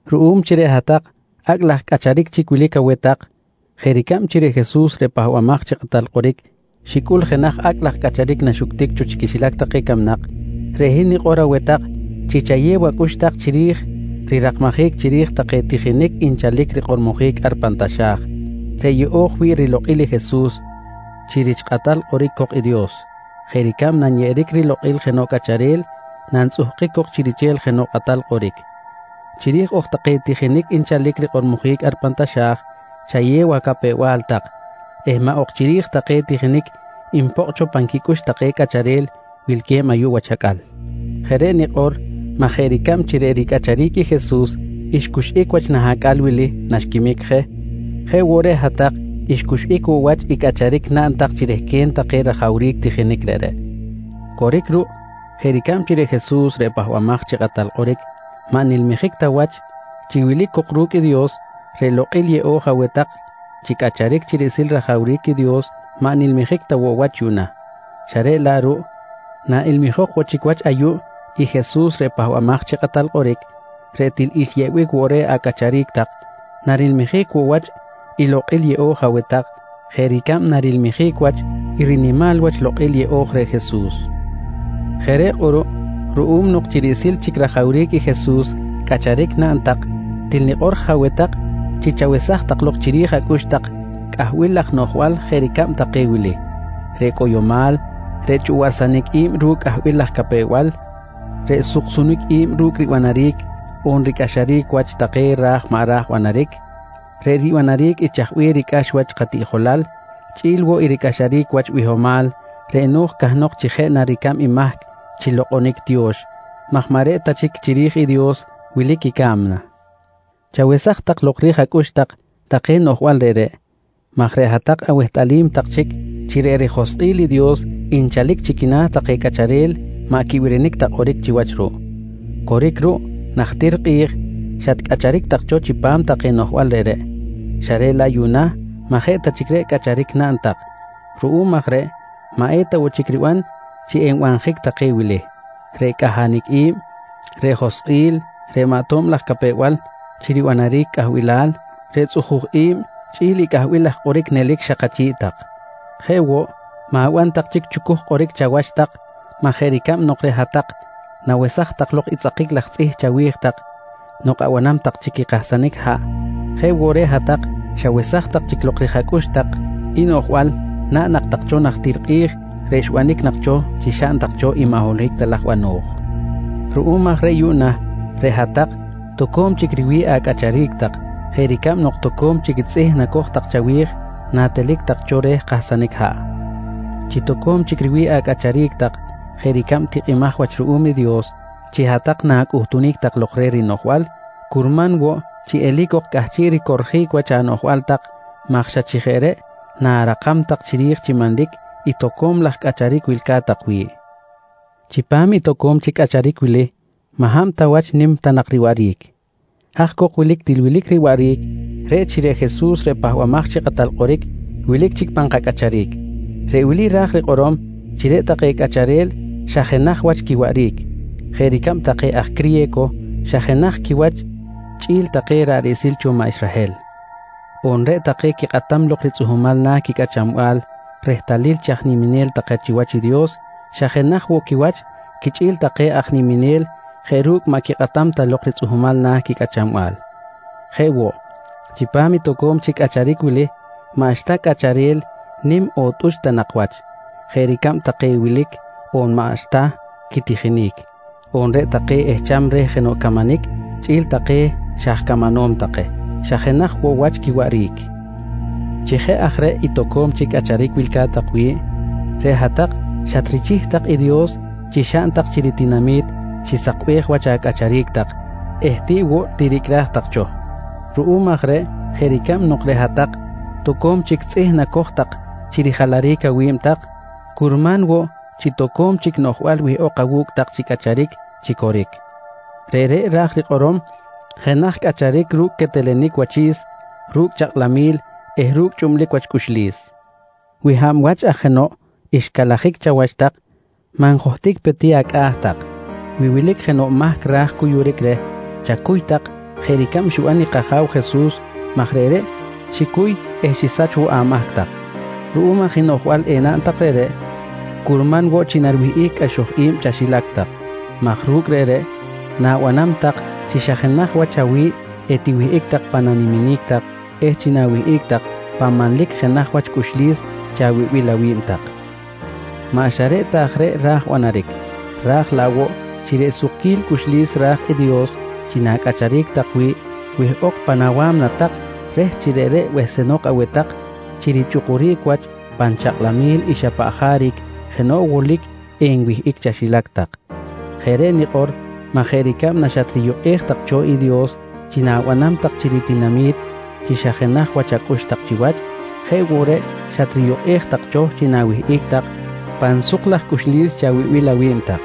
Ruꞌum chi reꞌ hat-tak acꞌ laj cꞌacharic chic wilic aweh tak jeꞌ ricab chi reꞌ Jesus reꞌ Pahbamaj chi Kꞌatal Kꞌoric xicꞌul jenaj acꞌ laj cꞌacharic naxuctic cho chi quixilac take camnak, reꞌ hin nikꞌor aweh tak chi chayew acꞌux tak chiri̱j rirakmajic chiri̱j take tijinic nchalic rikꞌormojic ar pan taxa̱j, reꞌ yeꞌo̱j wi̱ꞌ rilokꞌil i Jesus chi rich kꞌatal kꞌoric cok Dios jeꞌ ricab nanyeꞌeric rilokꞌil jenoꞌ cꞌacharel nantzꞌukunjic cok chi riche̱l jenoꞌ kꞌatal kꞌoric. Chiri̱j ok take tijinic nchalic rikꞌormojic ar pan taxa̱j chayew acapew-bal tak eh maꞌ ok chiri̱j take tijinic npokꞌ cho pan quicꞌux take cꞌacharel wilque̱b ayuꞌ wach acꞌal. Jeꞌ reꞌ nikꞌor maj jeꞌ ricab nok reꞌ ricꞌacharic i Jesus xcuxꞌic wach nah acꞌal wili naxquimic je, jeꞌ woꞌ reꞌ hat-tak xcuxꞌic woꞌ wach i cꞌacharic naꞌn tak chi rehquen take rajawric tijinic reꞌreꞌ. Coric ruꞌ jeꞌ ricab chi reꞌ Jesus reꞌ Pahbamaj chi Kꞌatal Kꞌoric maꞌ nilmijic ta wach chi wilic cok ru̱cꞌ i Dios, reꞌ lokꞌil yeꞌo̱j aweh tak chi cꞌacharic chi riꞌsil rajawric i Dios maꞌ nilmijic ta woꞌ wach yuꞌna xa reꞌ laꞌ ruꞌ naꞌilmijok woꞌ chic wach ayuꞌ i Jesus reꞌ Pahbamaj chi Kꞌatal Kꞌoric reꞌ til xyeꞌbic woꞌ reh acꞌacharic tak, narilmijic woꞌ wach i lokꞌil yeꞌo̱j aweh tak jeꞌ ricab narilmijic wach i rinimal wach i lokꞌil yeꞌo̱j reh Jesus. Jeꞌ reꞌ kꞌuruꞌ ruꞌum nok chi riꞌsil chic rajawric i Jesus cꞌacharic naꞌn tak, til nikꞌor je aweh chi chawesaj tak lok chiri̱j acꞌux cꞌahbil laj noꞌjbal jeꞌ ricab take wili: Reꞌ cꞌoyomal, reꞌ chꞌuwaꞌrsanic i̱b ru̱cꞌ cꞌahbil laj capew-bal, reꞌ suksunic i̱b ru̱cꞌ ribanaric on ricꞌaxaric wach take ra̱j maꞌ ra̱j banaric, reꞌ ribanaric i chaj bih ricꞌax wach katiꞌjolal, chꞌi̱l woꞌ i ricꞌaxaric wach bihomal reꞌ no̱j cahnok chi jeꞌ na ricab i mahc chi lokꞌonic tiyo̱x maj maꞌ reꞌ ta chic chiri̱j i Dios wilic ca̱mna. Chawesaj tak lok rij acꞌux tak take noꞌjbal reꞌreꞌ maj reꞌ hat-tak awehtꞌalim tak chic chi reꞌ rijoskꞌil i Dios nchalic chi quina̱ take cꞌacharel maꞌ quibirinic ta kꞌoric chiwach ruꞌ. Coric ruꞌ, najtir kꞌi̱j xatcꞌacharic tak cho chipam take noꞌjbal reꞌreꞌ xa reꞌ laꞌ yuꞌna maꞌ jeꞌ ta chic reꞌ cꞌacharic naꞌn tak. Ruꞌum aj reꞌ maꞌ eta woꞌ chic riban chi enbanjic take wili: Reꞌ cꞌahanic i̱b, reꞌ joskꞌil, reꞌ maꞌ tob laj capew-bal chi ribanaric cꞌahbilal, reꞌ tzꞌuju̱j i̱b chꞌi̱l i cꞌahbil laj kꞌoric nelic xak achi̱ꞌ tak. Jeꞌ woꞌ, ma̱ban tak chic chucuj kꞌoric chawach tak maj jeꞌ ricab nok reꞌ hat-tak nawesaj tak lok i tzꞌakic laj tzꞌih chawi̱j tak nok abanam tak chic i kahsanic haꞌ, jeꞌ woꞌ reꞌ hat-tak xawesaj tak chic lok rij acꞌux tak i noꞌjbal naꞌn nak tak cho najtir kꞌi̱j reꞌ xbanic nak cho chi xaꞌn tak cho i maꞌ holohic ta laj bano̱j. Ruꞌum aj reꞌ yuꞌna reꞌ hat-tak toco̱m chic riwi̱ꞌ acꞌacharic tak jeꞌ ricab nok toco̱m chic tzꞌih nacoj tak chawi̱j natelic tak cho reh kahsanic haꞌ. Chi toco̱m chic riwi̱ꞌ acꞌacharic tak jeꞌ ricab tikꞌimaj wach ruꞌum i Dios chi hat-tak na̱cꞌuhtunic tak lok reh rinoꞌjbal, curman woꞌ chi eli̱c ok cꞌahchiꞌ ricorjic wach anoꞌjbal tak maj xa chi jeꞌ reꞌ na̱rakam tak chiri̱j chi manlic i toco̱m laj cꞌacharic wilca̱t wi̱ꞌ. Chipam i toco̱m chic cꞌacharic wili, maꞌ hab ta wach nim ta nak riwaꞌric. Haj cok wilic til wilic riwaꞌric, reꞌ chi reꞌ Jesus reꞌ Pahbamaj chi Kꞌatal Kꞌoric wilic chic pan kacꞌacharic. Reꞌ wili ra̱j rikꞌorom chi reꞌ take cꞌacharel xa jenaj wach quiwaꞌric. Jeꞌ ricab take aj criye̱co xa jenaj quiwach chꞌi̱l take ra̱ꞌ riꞌsil cho maꞌ Israhel. On reꞌ take quikꞌatam lok ritzꞌuhmal na̱ quicꞌachanbal rehtalil chi aj niminel take chiwach i Dios xa jenaj woꞌ quiwach quichꞌi̱l take aj niminel jeꞌ ru̱cꞌ maꞌ quikꞌatam ta lok ritzꞌuhmal na̱ quicꞌachanbal. Jeꞌ woꞌ, chipam i toco̱m chic cꞌacharic wili maꞌxta cꞌacharel nim on tꞌuch ta nak wach. Jeꞌ ricab take wilic on maꞌxta quitijinic, on reꞌ take ehcham reh jenoꞌ camanic chꞌi̱l take xa aj camanom take, xa jenaj woꞌ wach quiwaꞌric. Chi jeꞌ aj reꞌ i toco̱m chic cꞌacharic wilca̱t tak wi̱ꞌ, reꞌ hat-tak xatrichih tak i Dios chi xaꞌn tak chi ritinami̱t xisakbej wach acꞌacharic tak eh tiꞌ woꞌ tiricꞌraj tak cho. Ruꞌum aj reꞌ jeꞌ ricab nok reꞌ hat-tak toco̱m chic tzꞌih nacoj tak chi rijalaric awi̱b tak, curman woꞌ chi toco̱m chic noꞌjbal wihꞌok awu̱cꞌ tak chi cꞌacharic chi coric. Reꞌreꞌ ra̱j rikꞌorom jenaj cꞌacharic ru̱cꞌ quetelenic wachi̱s, ru̱cꞌ chakꞌlamquil eh ru̱cꞌ chꞌublic wach cꞌuxlis. Wi hab wach aj jenoꞌ xcalajic chawach tak, maꞌ njohtic pe ti acꞌa̱ tak. Wi wilic jenoꞌ mahc ra̱j cuyuric reh, chacuy tak jeꞌ ricab xiban i kAja̱w Jesus maj reꞌreꞌ xicuy eh xisach woꞌ amahc tak. Ru̱cꞌ aj i noꞌjbal enaꞌn tak reꞌreꞌ curman woꞌ chi nariwihꞌic cꞌaxoj i̱b chaxilac tak maj ru̱cꞌ reꞌreꞌ na̱banam tak chi xa jenaj wach awi̱ꞌ etiwihꞌic tak pan niminic tak eh chi na̱wihꞌic tak pan manlic jenaj wach cꞌuxlis chawibil awi̱b tak. Maꞌ xa reꞌ ta aj reꞌ ra̱j banaric, ra̱j laꞌ woꞌ chi reꞌ sukquil cꞌuxlis ra̱j i Dios chi na̱cꞌacharic tak wi̱ꞌ wihꞌok pan awa̱mna tak reh chi reꞌreꞌ behsenok aweh tak chi richꞌukuric wach pan chakꞌlamil i xa paꞌ jaric jenoꞌ wolic enwihꞌic chaxilac tak. Jeꞌ reꞌ nikꞌor maj jeꞌ ricab naxatriyukꞌej tak cho i Dios chi na̱banam tak chi ritinami̱t chi xa jenaj wach acꞌux tak chiwach, jeꞌ woꞌ reꞌ xatriyukꞌej tak cho chi na̱wihꞌic tak pan suk laj cꞌuxlis chawibil awi̱b tak.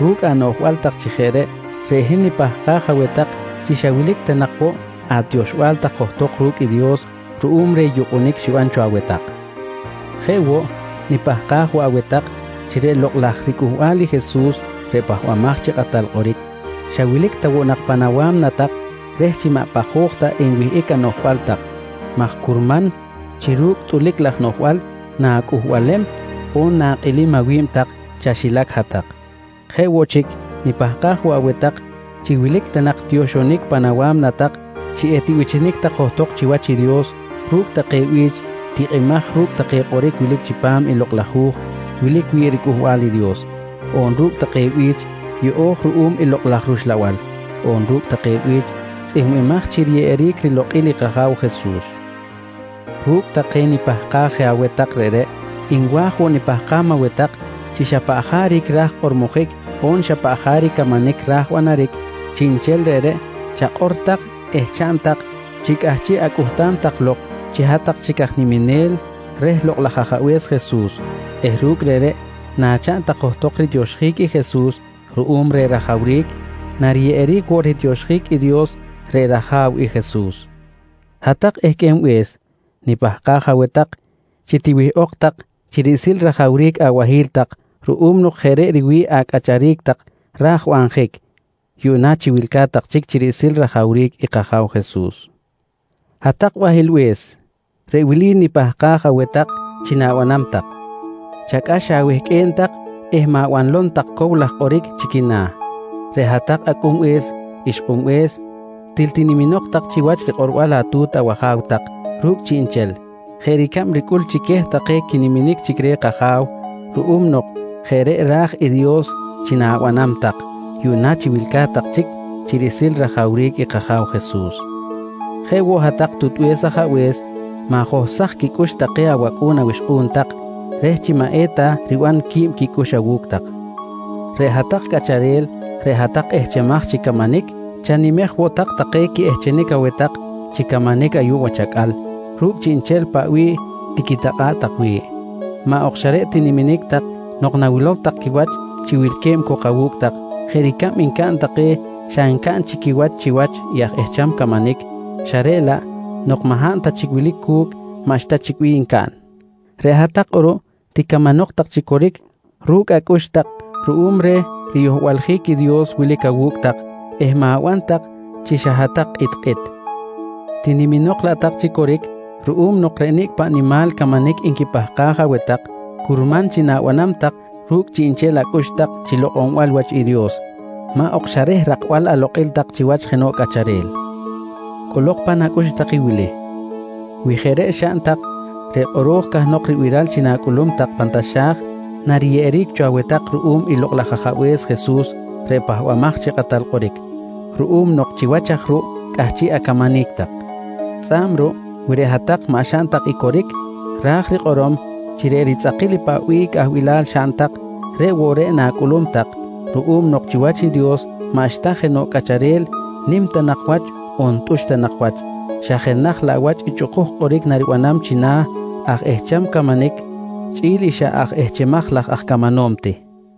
Ru̱cꞌ anoꞌjbal tak chi jeꞌ reꞌ, reꞌ hin nipahkaj aweh tak chi xa wilic ta nak woꞌ atioxbal tak johtok ru̱cꞌ i Dios ruꞌum reh yukꞌunic xiban cho aweh tak. Jeꞌ woꞌ, nipahkaj woꞌ aweh tak chi reꞌ lokꞌ laj ricꞌuhbal i Jesus reꞌ Pahbamaj chi Kꞌatal Kꞌoric, xa wilic ta woꞌ nak pan awa̱mna tak reh chi maꞌ pajoj ta enwihꞌic anoꞌjbal tak maj curman chi ru̱cꞌ tꞌulic laj noꞌjbal na̱cꞌuhbalem on na̱kꞌilim awi̱b tak chaxilac hat-tak. Jeꞌ woꞌ chic nipahkaj woꞌ aweh tak chi wilic ta nak tioxonic pan awa̱mna tak chi etibichinic tak johtok chiwach i Dios ru̱cꞌ take bi̱ch tikꞌimaj ru̱cꞌ take kꞌoric wilic chipam i Lokꞌ laj Hu̱j wilic wi̱ꞌ riCꞌuhbal i Dios, on ru̱cꞌ take bi̱ch yeꞌo̱j ruꞌum i Lokꞌ laj rUxlabal, on ru̱cꞌ take bi̱ch tzꞌihmbimaj chi riyeꞌeric rilokꞌil i kAja̱w Jesus. Ru̱cꞌ take nipahkaj je aweh tak reꞌreꞌ, nwa̱j woꞌ nipahkam aweh tak chi xa paꞌ jaric ra̱j kꞌormojic on xa paꞌ jaric camanic ra̱j banaric, chiꞌnchel reꞌreꞌ chakꞌor tak eh chaꞌn tak chi cꞌahchiꞌ acꞌuhtam tak lok chi hat-tak chic aj niminel reh Lokꞌ laj Ajabe̱s Jesus eh ru̱cꞌ reꞌreꞌ nachaꞌn tak johtok ritioxjic i Jesus ruꞌum reh rajawric, nariyeꞌeric woꞌ ritioxjic i Dios reꞌ rAja̱w i Jesus. Hat-tak ehqꞌuenbe̱s nipahkaj aweh tak chi tiwihꞌok chi riꞌsil rajawric abahi̱l tak ruꞌum nok jeꞌ reꞌ riwi̱ꞌ acꞌacharic tak ra̱j banjic yuꞌna chi wilca̱t tak chic chi riꞌsil rajawric i kAja̱w Jesus. Hat-tak bahilbe̱s, reꞌ wili nipahkaj aweh tak chi na̱banam tak: Chacꞌax awehqꞌue̱n tak eh ma̱banlom tak cow laj kꞌoric chi quina̱. Reꞌ hat-tak acꞌunbe̱s ixkꞌunbe̱s, til tiniminok tak chiwach rikꞌorbal atu̱t awaja̱w tak ru̱cꞌ chiꞌnchel jeꞌ ricab ricꞌul chi queh take quiniminic chic reh kAja̱w ruꞌum nok jeꞌ reꞌ ra̱j i Dios chi na̱banam tak yuꞌna chi wilca̱t tak chic chi riꞌsil rajawric i kAja̱w Jesus. Jeꞌ woꞌ hat-tak tutbe̱s ajabe̱s, ma̱johsaj quicꞌux take awacꞌu̱n awixkꞌu̱n tak reh chi maꞌ eta riban qui̱b quicꞌux awu̱cꞌ tak. Reꞌ hat-tak cꞌacharel, reꞌ hat-tak ehchemaj chi camanic chanimej woꞌ tak take quiꞌehchenic aweh tak chi camanic ayuꞌ wach acꞌal ru̱cꞌ chiꞌnchel paꞌ bih tiquitakꞌa̱ꞌ tak wi̱ꞌ, maꞌ ok xa reꞌ tiniminic tak nok nawilow tak quiwach chi wilque̱b cok awu̱cꞌ tak jeꞌ ricab ncaꞌn take xa ncaꞌn chic quiwach chiwach i aj ehcham camanic xa reꞌ laꞌ nok maꞌ hab ta chic wilic cu̱cꞌ maꞌxta chic bih ncaꞌn. Reꞌ hat-tak kꞌuruꞌ ticamanok tak chi coric ru̱cꞌ acꞌux tak ruꞌum reh riyohbaljic i Dios wilic awu̱cꞌ tak eh ma̱ban tak chi xa hat-tak kꞌitkꞌit, tiniminok laꞌ tak chi coric ruꞌum nok reꞌ nicꞌ paꞌ nimal camanic nquipahkaj aweh tak curman chi na̱banam tak ru̱cꞌ chiꞌnchel acꞌux tak chi lokꞌonbal wach i Dios, maꞌ ok xa reh rakbal alokꞌil tak chiwach jenoꞌ cꞌacharel. Cꞌolok tak pan acꞌux i wili: Wi jeꞌ reꞌ xaꞌn tak reꞌ kꞌoro̱j cahnok ribiral chi na̱cꞌulum tak pan taxa̱j nariyeꞌeric cho aweh tak ruꞌum i Lokꞌ laj Ajabe̱s Jesus reꞌ Pahbamaj chi Kꞌatal Kꞌoric ruꞌum nok chiwach aj reꞌ ruꞌ cꞌahchiꞌ acamanic tak. Tzꞌa̱b ruꞌ wi reꞌ hat-tak maꞌ xaꞌn tak i coric, ra̱j rikꞌorom chi reꞌ ritzꞌakil i paꞌ bih cꞌahbilal xaꞌn tak, reꞌ woꞌ reꞌ na̱cꞌulum tak ruꞌum nok chiwach i Dios maꞌxta jenoꞌ cꞌacharel nim ta nak wach on tꞌuch ta nak wach, xa jenaj laꞌ wach i chꞌukuj kꞌoric nariban china̱ aj ehcham camanic chꞌi̱l i xa aj ehchemaj laj aj camanom ti.